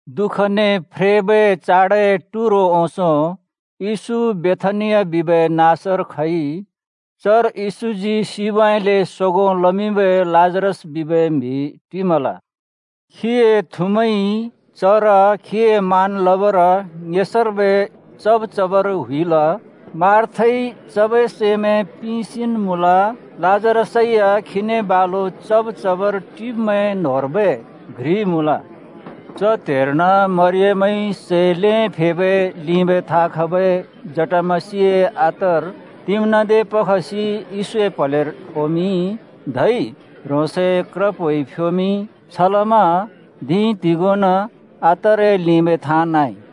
दुःखने फ्रेबै चाडए टुरो ओंसों येशू बेथानिया बिबै नाँसर खइ। चर येशूजी सिबउँइँले सोगों लमिंबै लाजरस बिबै म्हि टिमल। खीए थुमैंइ चर खीए मान लबर ङेसर्बै चब् चबर हुइल। मार्थाइ चबै सैमैं पिंसेन् मुँल। लाजरसै या खीने बालु चब् चबर टिब्मैं न्होंर्बै घ्रि मुँल। च त्‍हेर्न मरियमइ सै ल्हें फेबै लिंबै थाँ खबै जटामसिए अत्तर तिम्‍नादे पखसि येशूए प्हलेर फोमिंइ। धै ह्रोंसए क्रप्होइ फ्‍योमिंइ। छलमा धिं तिगोंन् अत्तरए लिंबै थाँ नाँइ।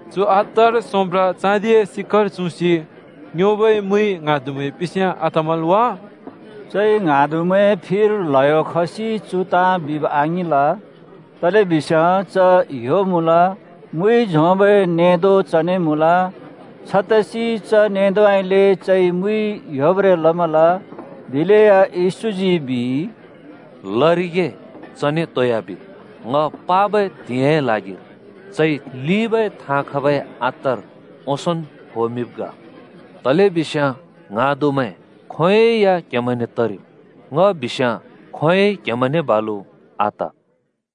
“चु अत्तर सोंब्रा चाँदिए सिक्‍कर चुँसि योंबै मुइ ङ्हाँदुमैं पिंस्याँ आतमल् वा?” चइ ङ्हाँदुमैंए फिर ल्हयो खसि चु ताँ बिब् आङिंल। तलेबिस्याँ च ह्‍यो मुँल। मुइ झोंबै नेंदो चने मुँल। छतसि च नेंदोउँइँले चइ मुइ ह्‍योब्रें लमल। दिलेया येशूजी बिइ, “लरिगे, चने तोइ आबिद्! ङ पाबै त्हिंइए ल्हागिर चइ लिंबै थाँ खबै अत्तर ओंसोंन् फोमिंब् ग। तलेबिस्याँ ङ्हाँदुमैं खोंयोंइ या क्‍हेमैंने तरिम्। ङ बिस्याँ खोंयोंइ क्‍हेमैंने बालु आत।”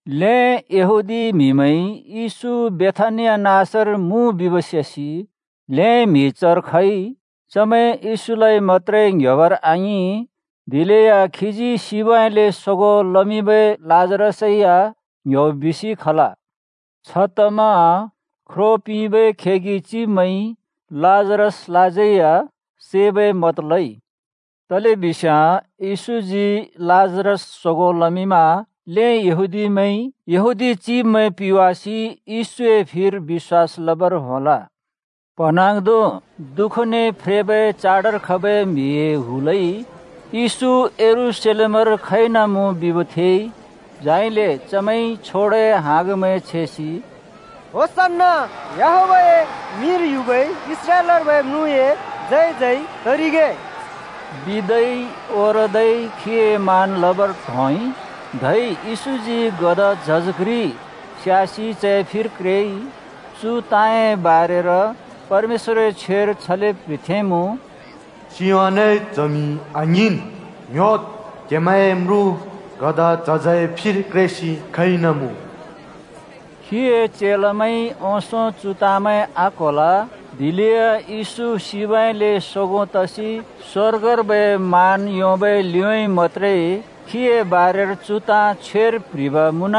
ल्हें यहूदी म्हिमैंइ येशू बेथानिया नाँसर मुँ बिब् सेसि ल्हें म्हि चर खइ। चमैं येशूलाइ मत्‍त्रे ङ्योबर आङिं, दिलेया खीजी सिबउँइँले सोगों लमिंबै लाजरसै या ङ्‍ह्‍योब् बिसि खल। छतमा ख्रो पिंबै खेगि चिब्मैंइ लाजरसलाज्यै या सैबै मत लइ। तलेबिस्याँ येशूजी लाजरस सोगों लमिंमा ल्हें यहूदीमैंइ यहूदी चिब्मैं पिवासि येशूए फिर बिश्‍वास लबर होंल। प्‍हँन्हाँग्धों दुःखने फ्रेबै चाडर खबै म्हिए हुलइ येशू यरूशलेमर खइनामुँ बिब् थेइ। झाइले चमैंइ छोडाए हाँगमैं छेसि “होसन्‍ना! याहवेहए मिंर युबै इस्राएलर्बै म्रुँए जय जय तरिगे!” बिदै ओरदै खीए मान लबर त्होंइ। धै येशूजी गधा झज घ्रि स्यासि चए फिर क्रेइ। चु ताँए बारेर परमेश्‍वरए छ्वेर छले प्‍ह्रिथेंमुँ: सियोनए च्हमि आङ्हिंन्! ङ्‌ह्‍योद्! क्‍हेमैंए म्रुँ गधा झजए फिर क्रेसि खइनमुँ। खीए चेलामैंइ ओंसों चु ताँमैं आक्होल। दिलेया येशू सिबउँइँले सोगों तसि स्वर्गर्बै मान योंबै लिउँइँ मत्‍त्रे खीए बारेर चु ताँ छ्वेर प्ह्रिब् मुँन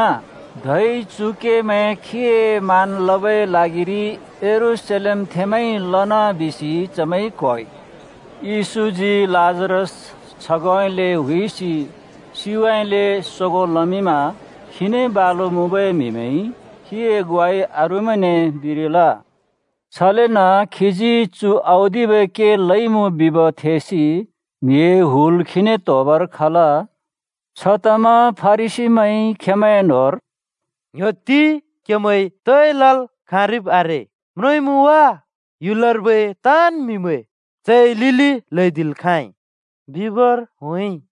धै चु केमैं खीए मान लबै ल्हागिरि यरूशलेमथेंमैंइ लना बिसि चमैंइ क्होइ। येशूजी लाजरस छगोंउँइँले हुइसि सिबउँइँले सोगों लमिंमा। खीने बालु मुँबै म्हिमैंइ खीए ग्वाइ अरूमैंने बिरिल। छलेन खीजी चु औदिबै के लइमुँ बिब् थेसि म्हिए हुल खीने त्होबर खल। छतमा फरिसीमैंइ खेंमैंए न्होंर “ङ्‍ह्‍‍योत्ति! कहेमैंइ तोइ लल् खाँरिब् आरे। म्रोंइँमुँ वा, ह्‍युलर्बै ताँन् म्हिमैं चए लिलि ल्हैदिल् खाँइ बिबर होंइ।”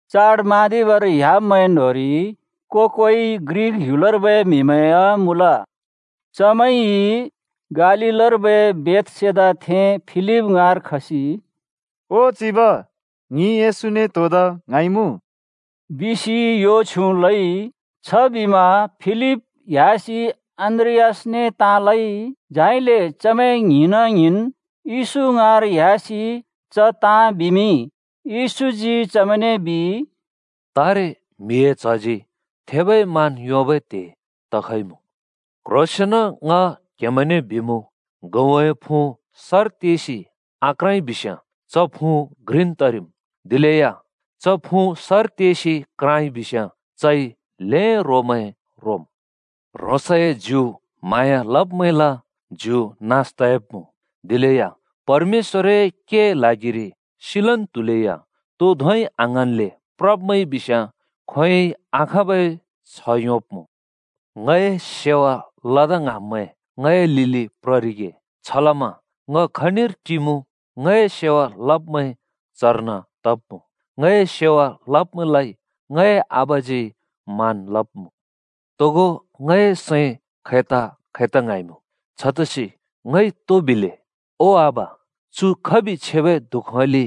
चाड म्हाँदिबर ह्‍याब्मैं न्होंरि को-कोइ ग्रिक ह्‍युलर्बै म्हिमैं या मुँल। चमैंइ गालीलर्बै बेथसेदाथें फिलिप ङाँर खसि “ओ चिब, ङि येशूने त्होदा ङ्हाँइमुँ,” बिसि यो छ्युँ लइ। छबिमा फिलिप ह्‍यासि अन्‍द्रियासने ताँ लइ। झाइले चमैं ङ्हिंना ङ्हिंन् येशू ङाँर ह्‍यासि च ताँ बिमिंइ। येशूजी चमैंने बिइ, “तारे म्हिए च्हजी थेबै मान योंबै त्‍हे तखइमुँ। क्ह्रोंसेंन ङ क्हेमैंने बिमुँ, गहुँए फुँ सर तेसि आक्राँइ बिस्याँ च फुँ घ्रिन् तरिम्। दिलेया च फुँ सर तेसि क्राँइ बिस्याँ चइ ल्हें रोमैं रोम्। ह्रोंसए ज्यु म्हाँया लब्मैंला ज्यु नास तयाब्मुँ। दिलेया परमेश्‍वरए केए ल्हागिरि सिलन् त्हुलेया तो धोंइ आङ्हाँन्ले प्रब्मैंइ बिस्याँ खोंयोंइ आखाँबै छ्ह योंब्‍मुँ। “ङए सेवा लदा ङ्हाँब्मैं ङए लिलि प्ररिगे। छलमा ङ खनिर टिमुँ, ङए सेवा लब्मैं चर्न तब्मुँ। ङए सेवा लब्मैंलाइ ङए आबाजी मान लब्मुँ।” “तोगो ङए सैं खैता-खैता ङ्हाँइमुँ। छतसि ङइ तो बिले? ‘ओ आबा, चु खबि छेबै दुःखउँइँले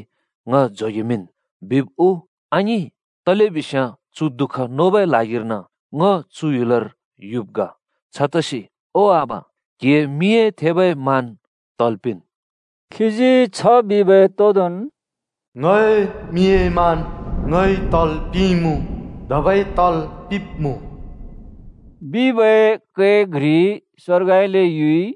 ङ जोगेमिंन्,’ बिब् उ? आङिं, तलेबिस्याँ चु दुःख नोबै ल्हागिर्न ङ चु ह्‍युलर युब् ग। छतसि, ओ आबा, क्‍हिए मिंए थेबै मान तल् पिंन्।” बिबै तोदोंन् “ङए मिंए मान ङइ तल् पिंइँमुँ, धबै तल् पिंब्मुँ बिबै कै घ्रि स्‍वर्गउँइँले युइ।”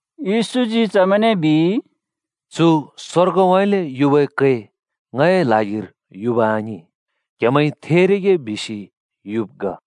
येशूजी चमैंने बिइ, “चु स्वर्गउँइँले युबै कै ङए ल्हागिर युब आङिं, क्हेमैंइ थेरिगे बिसि युब् ग।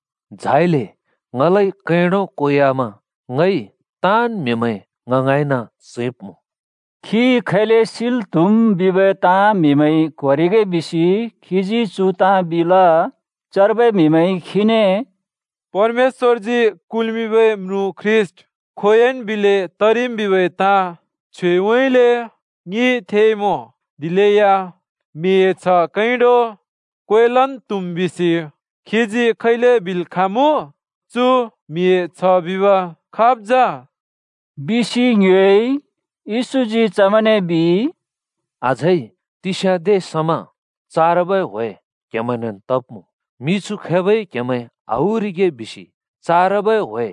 झाइले ङलाइ कैंडो क्वेवामा ङइ ताँन् म्हिमैं ङ ङाँइन चैंब्मुँ।” खी खैले सिल् त्हुम् बिबै ताँ म्हिमैंइ क्होरिगे बिसि खीजी चु ताँ बिल। चर्बै म्हिमैंइ खीने “परमेश्‍वरजी कुल्मिंबै म्रुँ ख्रीष्‍ट खोंयोंन् बिलै तरिम् बिबै ताँ छ्वेउँइँले ङिइ थेइमुँ। दिलेया म्हिए च्ह कैंडो क्वेलन् त्हुम् बिसि क्हिजी खैले बिल् खाँमुँ? चु म्हिए च्ह बिब् खाब् जा?” बिसि ङ्योएइ। येशूजी चमैंने बिइ, “अझै तिस्याँदे समा चारबै ह्‍वे क्‍हेमैंनेन् तब्मुँ। मिछु खैबइ क्हेमैं आहुरिगे बिसि चारबै ह्‍वे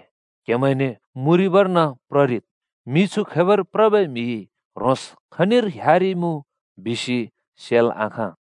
क्हेमैंने मुँरिबर्न प्ररिद्। मिछु खैबर प्रबै म्हिइ ह्रोंस् खनिर ह्‍यारिइमुँ बिसि सेल् आखाँ।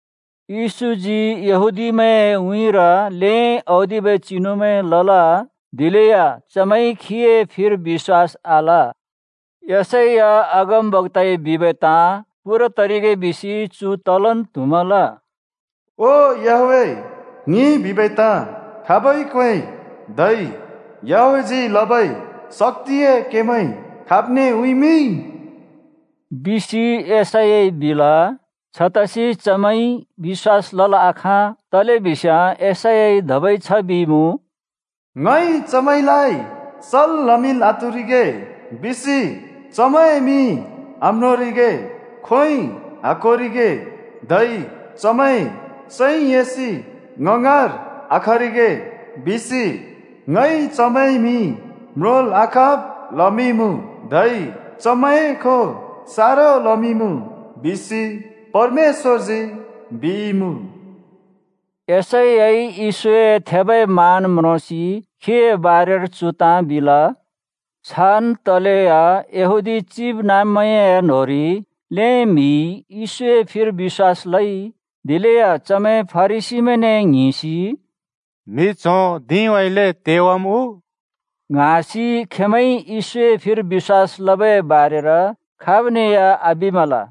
येशूजी यहूदीमैंए उँइँर ल्हें औदिबै चिनुमैं लल। दिलेया चमैंइ खीए फिर बिश्‍वास आल। यशैया अगमबक्‍ताइ बिबै ताँ पूरा तरिगे बिसि चु तलन् त्हुमल। “ओ याहवेह, ङिइ बिबै ताँ खाबइ क्‍वेंइ? धै याहवेहजी लबै शक्‍तिए केमैं खाब्ने उँइँमिंइ?” बिसि यशैयाइ बिल। छतसि चमैंइ बिश्‍वास लल् आखाँ। तलेबिस्याँ यशैयाइ धबै छ बिइमुँ, ङइ चमैंलाइ सल् लमिंल् आत्हुरिगे बिसि चमैंए मिइ आम्रोंरिगे, खोंइ आक्होरिगे, धै चमैं सैं एसि ङ ङाँर आखरिगे बिसि ङइ चमैंए मि म्रोंल् आखाँब् लमिंइँमुँ, धै चमैंए खों सारो लमिंइँमुँ, बिसि परमेश्‍वरजी बिइमुँ। यशैयाइ येशूए थेबै मान म्रोंसि खीए बारेर चु ताँ बिल। छान् तलेया यहूदी चिबनाँब्मैंए न्होंरि ल्हें म्हिइ येशूए फिर बिश्‍वास लइ। दिलेया चमैं फरिसीमैंने ङ्हिंसि “म्हि च्हों धिंउँइँले तेवाम् उ?” ङ्हाँसि खेंमैंइ येशूए फिर बिश्‍वास लबै बारेर खाबने या आबिमल।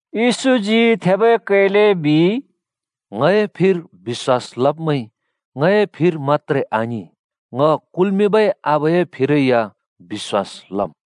येशूजी थेबै कैले बिइ, “ङए फिर बिश्‍वास लब्‍मैंइ ङए फिर मत्‍त्रे आङिं, ङ कुल्मिंबै आबाए फिरै या बिश्‍वास लमुँ।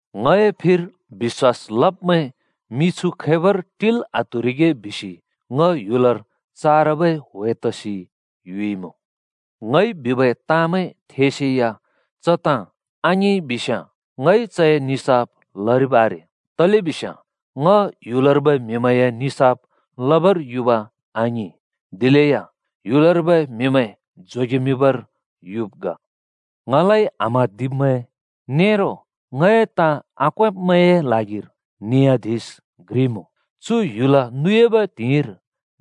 ङए फिर बि‍श्‍वास लब्मैं मिछु खैबर टिल् आत्हुरिगे बिसि ङ ह्‍युलर चारबै ह्‍वे तसि युइमुँ। ङइ बिबै ताँमैं थेसेया च ताँ आङिंइ बिस्याँ, ङइ चए निसाफ लरिब् आरे, तलेबिस्याँ ङ ह्‍युलर्बै म्हिमैंए निसाफ लबर युब आङिं, दिलेय ह्‍युलर्बै म्हिमैं जोगेमिंबर युब् ग। ङलाइ आम्हाँदिब्मैं नेरो ङए ताँ आक्वेंब्मैंए ल्हागिर नियाधिश घ्रि मुँ। चु ह्‍युल नुयाबै त्हिंइर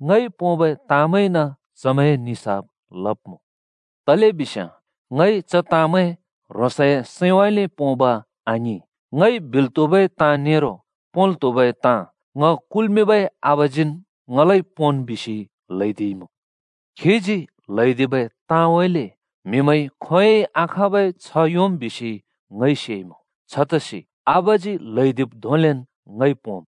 ङइ पोंबै ताँमैंइन चमैंए निसाफ लब्मुँ। तलेबिस्याँ ङइ च ताँमैं ह्रोंसए सैंउँइँले पोंब आङिं। ङइ बिल् त्हुबै ताँ नेरो पोंल् त्हुबै ताँ ङ कुल्मिंबै आबाजीन् ङलाइ ‘पोंन्’ बिसि ल्हैदिइमुँ। खीजी ल्हैदिबै ताँउँइँले म्हिमैंइ खोंयोंइ आखाँबै छ्ह योंम् बिसि ङइ सेइमुँ। छतसि आबाजी ल्हैदिब् धोंलेन् ङइ पोंम्।”